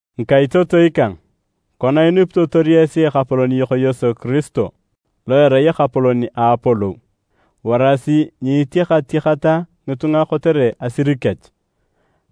Ngikaitotoi kang, kona inupitotor esi Ekapolon yok Yesu Kiristo lo erai Ekapolon a apolou, warasi nyiitiakatiakata ngitunga kotere asir kech.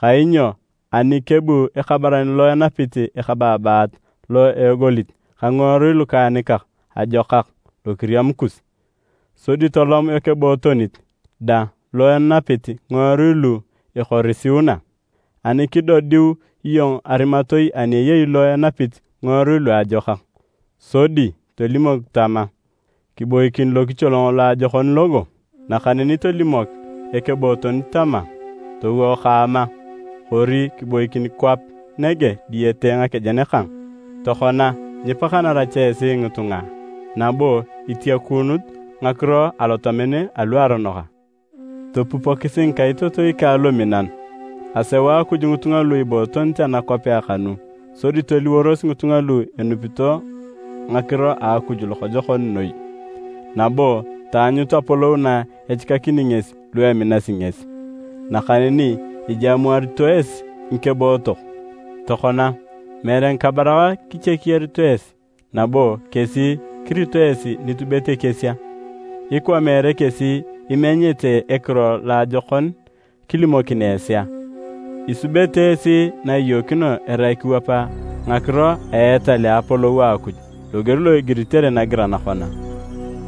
Kainyo ani kebu ekabaran lo enapit ekabaabat lo egolit ka ngiworui lukaanikak ajokak lokiriam kus, sodi tolom ekebootonit dang lo enapit ngiworui lu ekorisiuna. Ani kidodiu iyong arimatoi ani eyei lo enapit ngiworui luajokak sodi tolimok tama, “Kiboikin lokicholong loajokon logo,” nakaneni tolimok ekebootonit tama, “Towo kaama, kori kiboikin kwap nege diyete ngakejen kang,” tokona, nyipakanara cha esi ngitunga a, nabo itiakuunut ngakiro alotamen aluaronok a? Topupokisi ngikaitotoi kang luminan! Aseu Akuj ngitunga lu ibootonit anakwapea kanu sodi toliworos ngitunga lu enupito ngakiro a Akuj lokojokon noi, nabo taanyut apolou na echikakini ngesi lu eminasi ngesi. Nakaneni ijamuarito esi ngikebootok! Tokona, meere ngikabarak kichekiyarito esi nabo kesi kirito esi nitubet ekies a? Ikwa meere kesi imenyete ekiro loajokon kilimokin esi a? Isubete esi na iyookino erai kiwap ngakiro a etal a Apolou a Akuj loger lo igiritere nagiran kona,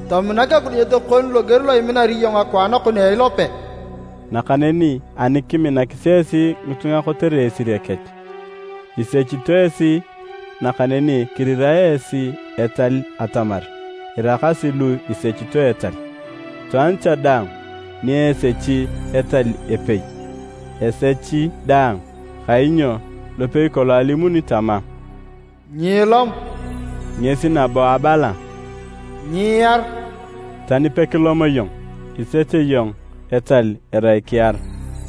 “Tominak ekidunyet kon loger lo iminar iyong akwaan kon a ilope.” Nakaneni ani kiminakis esi ngitunga kotere esire kech, isechito esi nakaneni kirirae esi etal atamar iraakasi lu isechito etal. Itwaan cha daang ni esechi etal epei, esechi daang. Kainyo lopei kolong alimuni tama, “Nyiilom,” ngesi nabo abala, “Nyiiar.” Tani pekilom iyong, isech iyong etal erai kiar.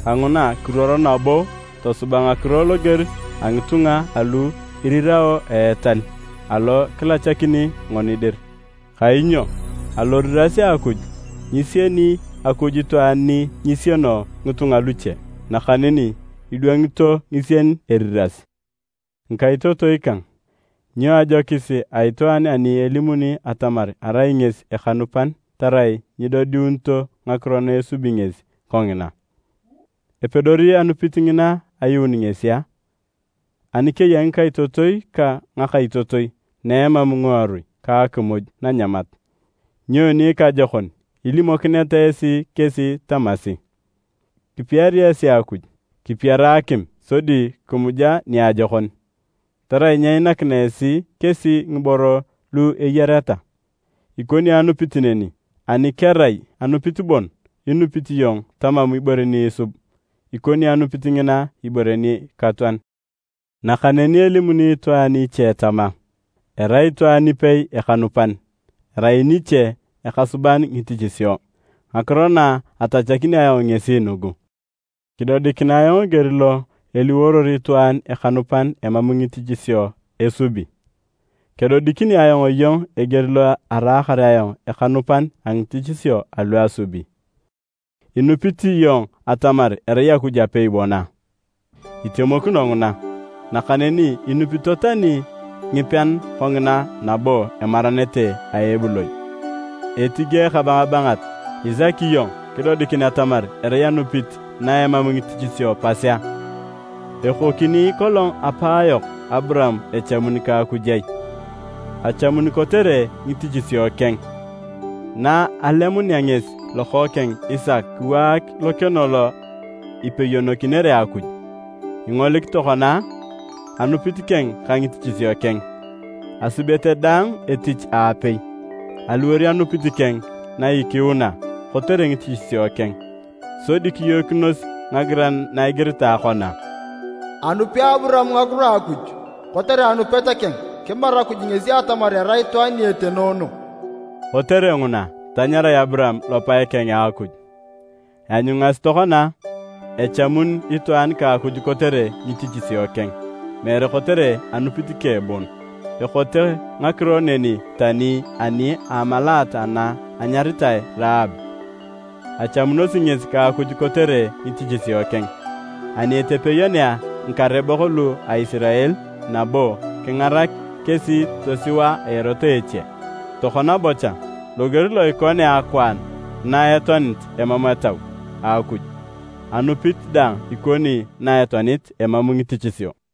Kanguna kiruoro nabo tosuba ngakiro loger a ngitunga alu irirao a etal alo kilachakini ngoni dir. Kainyo aloriras a Akuj, nyisieni Akuj itwaan ni nyisieno ngitunga luche, nakaneni idwangito ngisien eriras. Ngikaitotoi kang, nyoni ajokis a itwaan ani elimuni atamar arai ngesi ekanupan tarai nyidodiunito ngakiro na esubi ngesi kongina? Epedori anupit ngina ayuun ngesi a? Ani keya ngikaitotoi ka ngakaitotoi na emam ngiworui ka akimuj nanyamat. Nyoni ikajokon ilimokineta esi kesi tamasi, “Kipiari esi Akuj! Kipiara akim sodi kimuja niajokon!” Tarai nyeinakina esi kesi ngiboro lu eyareta? Ikoni anupit neni, ani kerai anupit bon inupit iyong tamam ibore ni isubi, ikoni anupit ngina ibore nikatoan. Nakaneni elimuni itwaan iche tama, “Erai itwaan ipei ikanupan, erai niche nikasuban ngitichisio.” Ngakiro na atachakini ayong ngesi nugu, “Kidodikinae ayong eger lo eliworor itwaan ekanupan emam ngitichisio esubi. Kedodikini ayong iyong eger lo araakar ayong ekanupan a ngitichisio alu asubi.” Inupit iyong atamar erai Akuj apei bon a? Itemokino nguna! Nakaneni enupito tani ngipean kongina, nabo emaranete a ebuloi. Etige ekabangabangat! Isaki iyong kidodikin atamar erai anupit na emam ngitichisio pas a? Ekokini kolong apaayok Aburaam echamun ka Akuj ai? Achamun kotere ngitichisio keng, na alemunea ngesi lokookeng Isaka kiwaak lokeno lo ipeyonokinere Akuj. Ingolik tokona a? Anupit keng ka ngitichisio keng, asubete daang etich aapei, aliwor anupit keng na ikiuna kotere ngitichisio keng. Sodi kiyookinos ngagiran na igiritae kona, “Anupi Aburaam ngakiro a Akuj, kotere anupit keng, kimaru Akuj ngesi atamar erai itwaan ni etenoono.” Kotere nguna tanyarae Aburaam lopae keng a Akuj. Ianyungasi tokona a, echamun itwaan ka Akuj kotere ngitichisio keng, meere kotere anupit keng bon. Ekote ngakiro neni tani ani a amalaat ana anyaritae Raab. Achamunosi ngesi ka Akuj kotere ngitichisio keng, ani etepeyonea ngikarebok lu a Isirael nabo kingarak kesi tosiwa a erot a eche. Tokona bocha, loger lo ikonea akwaan na etoanit emam Etau a Akuj, anupit dang ikoni na etoanit emam ngitichisio.